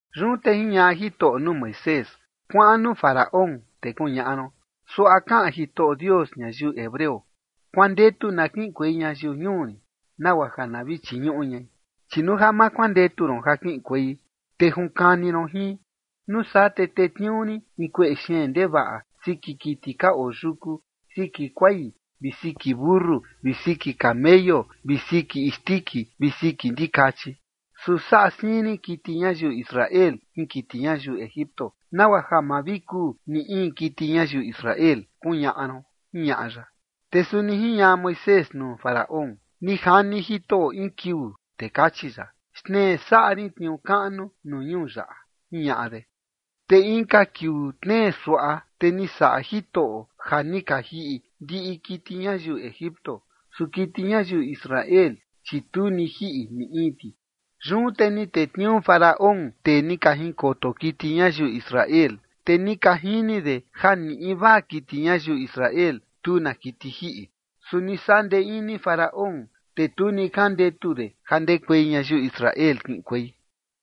Yun te jiñaꞌa Jitoꞌo nuu Moisés: ―Kuaꞌan nuu Faraón, te kuñaꞌa ron: “Suaꞌa kaꞌan Jitoꞌo Dios ñayiu hebreo: Kuandetu na kiꞌinkuei ñayiu ñuu rin, nagua ja na vi chiñuꞌu ñai. Chi nuu ja ma kuandetu ron ja kiꞌinkuei, te junkani ron jin, nuu saa, te tetniuu rin in kueꞌe xeen ndevaꞌa siki kiti ka oo yuku, siki kuai vi siki mentu vi siki kameyu vi siki isndiki vi siki ndikachi. Su saꞌa siin rin kiti ñayiu Israel jin kiti ñayiu Egipto, nagua ja ma vi kuu ni in kiti ñayiu Israel”, kuñaꞌa ron ―jiñaꞌa ya. Te suni jiñaꞌa Moisés nuu Faraón: ―Ni jani Jitoꞌo in kiuu, te kachi ya: “Xtnee saꞌa rin tniuu kaꞌnu nuu ñuu yaꞌa” ―jiñaꞌa de. Te inka kiuu tnee suaꞌa, te ni saꞌa Jitoꞌo ja ni ka jiꞌi ndiꞌi kiti ñayiu Egipto, su kiti ñayiu Israel, chi tu ni jiꞌi ni in ti. Yun te ni tetniuu Faraón tee ni ka jinkoto kiti ñayiu Israel, te ni ka jini de ja ni invaa kiti ñayiu Israel tu na kiti jiꞌi. Su ni saꞌa ndee ini Faraón, te tu ni jandetu de ja ndekuei ñayiu Israel kiꞌinkuei.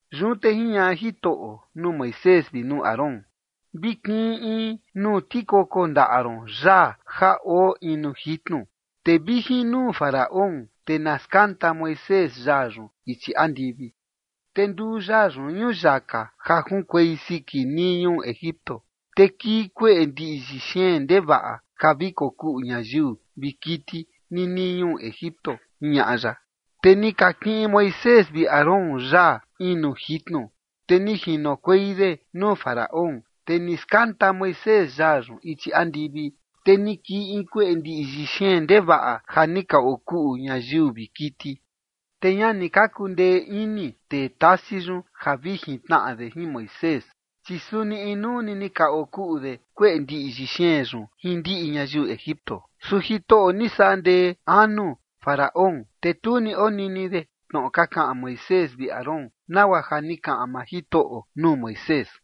Yun te jiñaꞌa Jitoꞌo nuu Moisés vi nuu Aarón: ―Vi kiꞌin in nuu tikoko ndaꞌa ron yaa ja oo in nuu jitnu, te vi jin nuu Faraón, te na skanta Moisés yaa yun ichi andivi. Te nduu yaa yun ñuyaka ja junkuei siki nii ñuu Egipto, te kii kueꞌe ndiꞌyi xeen ndevaꞌa ja vi kokuꞌu ñayiu vi kiti ninii ñuu Egipto ―jiñaꞌa ya. Te ni ka kiꞌin Moisés vi Aarón yaa in nuu jitnu, te ni jinokuei de nuu Faraón. Te ni skanta Moisés yaa yun ichi andivi, te ni kii in kueꞌe ndiꞌyi xeen ndevaꞌa ja ni ka okuꞌu ñayiu vi kiti. Te ña ni ka kundee ini tee tasi yun ja vi jintnaꞌa de jin Moisés, chi suni inuu ni ka okuꞌu de kueꞌe ndiꞌyi xeen yun jin ndiꞌi ñayiu Egipto. Su Jitoꞌo ni saꞌa ndee anu Faraón, te tu ni onini de tnoꞌo ka kaꞌan Moisés vi Aarón, nagua ja ni kaꞌan maa Jitoꞌo nuu Moisés.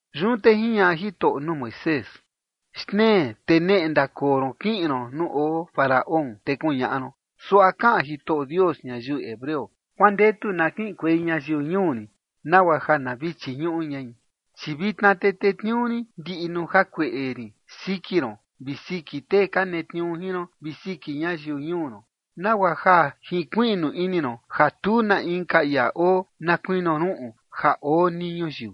Yun te jiñaꞌa Jitoꞌo nuu Moisés: ―Xtnee te neꞌe ndakoo ron kiꞌin ron nuu oo Faraón, te kuñaꞌa ron: “Suaꞌa kaꞌan Jitoꞌo Dios ñayiu hebreo: Kuandetu na kiꞌinkuei ñayiu ñuu rin, nagua ja na vi chiñuꞌu ñai. Chi vitna te tetniuu rin ndiꞌi nuu jakueꞌe rin siki ron vi siki tee ka netniuu jin ron vi siki ñayiu ñuu ron, nagua ja jinkuiꞌnu ini ron ja tu na inka ia oo na kuinio ruꞌun ja oo nii ñuyiu.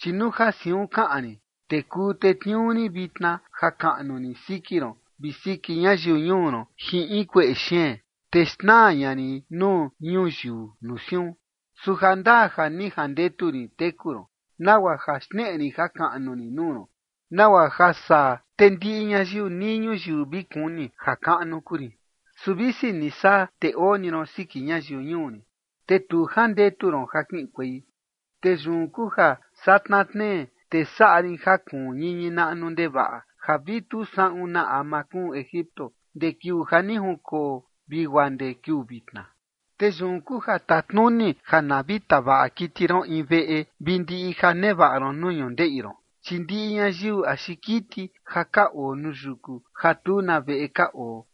Chi nuu ja siun kaꞌan rin, te kuu tetniuu rin vitna jakaꞌnu rin siki ron vi siki ñayiu ñuu ron jin in kueꞌe xeen, te xnaa ña rin nuu ñuyiu nuu siun. Su jandaa ja ni jandetu rin teku ron, nagua ja xneꞌe rin jakaꞌnu rin nuu ron, nagua ja saa te ndiꞌi ñayiu nii ñuyiu vi kuni jakaꞌnu kuu rin. Su visi ni saa, te oo ni ron siki ñayiu ñuu rin, te tu jandetu ron ja kiꞌinkuei. Te yun kuu ja satna tnee, te saꞌa rin ja kuun ñiñi naꞌnu ndevaꞌa ja vi tu saꞌun na ama kuun Egipto ndee kiuu ja ni junkoo vi guaa ndee kiuu vitna. Te yun kuu ja tatnuni ja na vi tavaꞌa kiti ron in veꞌe vi ndiꞌi ja nevaꞌa ron nuu ñundeꞌi ron, chi ndiꞌi ñayiu axi kiti ja ka oo nuu yuku ja tu na veꞌe ka oo,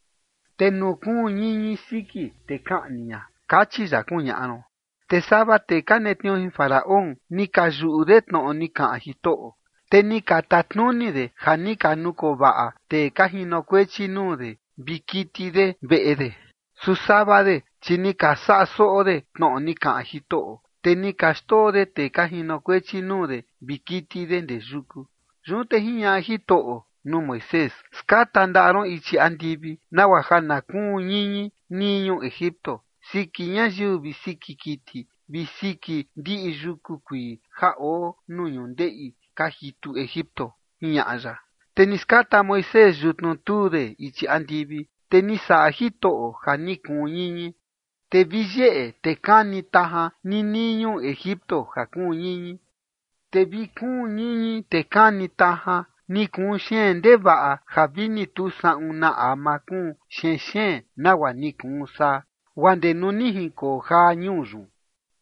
te nuu kuun ñiñi siki, te kaꞌni ña, kachi ya”, kuñaꞌa ron. Te sava tee ka netniuu jin Faraón ni ka yuꞌu de tnoꞌo ni kaꞌan Jitoꞌo, te ni ka tatnuni de ja ni ka nukoo vaꞌa tee ka jinokuechi nuu de vi kiti de veꞌe de. Su sava de, chi ni ka saꞌa soꞌo de tnoꞌo ni kaꞌan Jitoꞌo, te ni ka xndoo de tee ka jinokuechi nuu de vi kiti de ndee yuku. Yun te jiñaꞌa Jitoꞌo nuu Moisés: ―Skata ndaꞌa ron ichi andivi, nagua ja na kuun ñiñi nii ñuu Egipto siki ñayiu vi siki kiti vi siki ndiꞌi yuku kuii ja oo nuu ñundeꞌi ka jitu Egipto ―jiñaꞌa ya. Te ni skata Moisés yutnu tuu de ichi andivi, te ni saꞌa Jitoꞌo ja ni kuun ñiñi, te vi yeꞌe, te kani tajan ninii ñuu Egipto ja kuun ñiñi. Te vi kuun ñiñi, te kani tajan, ni kuu xeen ndevaꞌa ja vi ni tu saꞌun na ama kuu xenxeen nagua ni kuun saa, guaa ndee nuu ni junkoo jaa ñuu yun.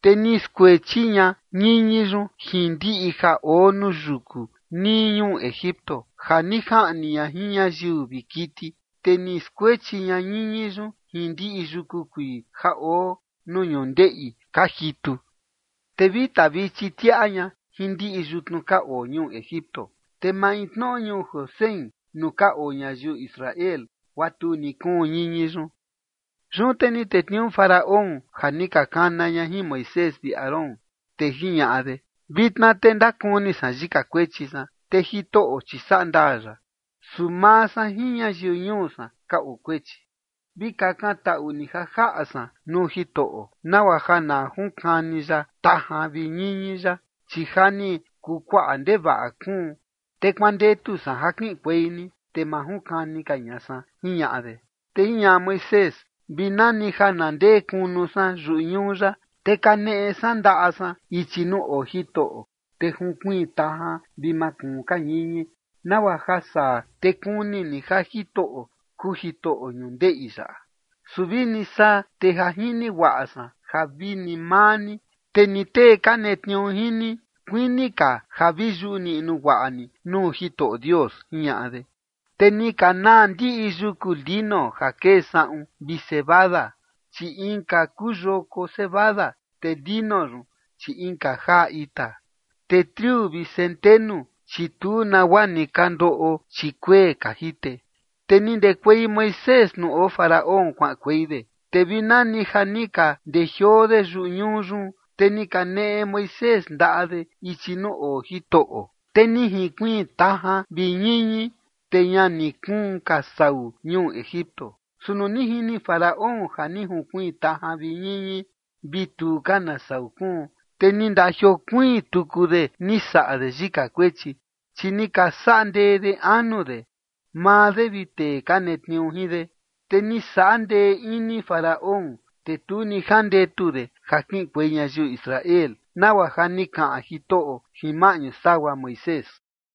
Te ni skuechi ña ñiñi yun jin ndiꞌi ja oo nuu yuku nii ñuu Egipto, ja ni jaꞌni ña jin ñayiu vi kiti, te ni skuechi ña ñiñi yun jin ndiꞌi yuku kuii ja oo nuu ñundeꞌi ka jitu, te vi tavichi tiaꞌa ña jin ndiꞌi yutnu ka oo ñuu Egipto yun. Te maintnoꞌo ñuu Gosén nuu ka oo ñayiu Israel, guaa tu ni kuun ñiñi yun. Yun te ni tetniuu Faraón ja ni ka kana ña jin Moisés vi Aarón, te jiñaꞌa de: ―Vitna te ndakuni san yika kuechi san. Te Jitoꞌo, chi saꞌa ndaa ya, su maa san jin ñayiu ñuu san ka oo kuechi. Vi kakan taꞌu ni ja jaꞌa san nuu Jitoꞌo, nagua ja na junkani ya tajan vi ñiñi yaꞌa, chi ja ni kuu kuaꞌa ndevaꞌa kuun, te kuandetu san ja kiꞌinkuei ni, te ma junkani ka ña san ―jiñaꞌa de. Te jiñaꞌa Moisés: ―Vi nani ja na ndee kunu san yuꞌu ñuu yaꞌa, te kaneꞌe san ndaꞌa san ichi nuu oo Jitoꞌo, te junkuiin tajan vi ma kuun ka ñiñi, nagua ja saa, te kuni ni ja Jitoꞌo kuu Jitoꞌo ñundeꞌi yaꞌa. Su vini saa, te ja jini guaꞌa san ja vini maa ni, te ni tee ka netniuu jin ni, kuini ka ja vi yuꞌu niꞌnu guaꞌa ni nuu Jitoꞌo Dios ―jiñaꞌa de. Te ni ka naa ndiꞌi yuku lino ja kee saꞌun vi cebada, chi inka kuu yoko cebada, te lino yun, chi inka jaa ita. Su triu vi centenu, chi tu nagua ni ka ndoꞌo, chi kuee ka jite. Te ni ndekuei Moisés nuu oo Faraón kuaꞌankuei de, te vi nani ja ni ka ndejioo de yuꞌu ñuu yun, te ni kaneꞌe Moisés ndaꞌa de ichi nuu oo Jitoꞌo, te ni jinkuiin tajan vi ñiñi, te ña ni kuun ka sau ñuu Egipto. Su nuu ni jini Faraón ja ni junkuiin tajan vi ñiñi vi tu ka na sau kuun, te ni ndajiokuiin tuku de ni saꞌa de yika kuechi. Chi ni ka saꞌa ndee de anu de, maa de vi tee ka netniuu jin de. Te ni saꞌa ndee ini Faraón, te tu ni jandetu de ja kiꞌinkuei ñayiu Israel, nagua ja ni kaꞌan Jitoꞌo jin maꞌñu sagua Moisés.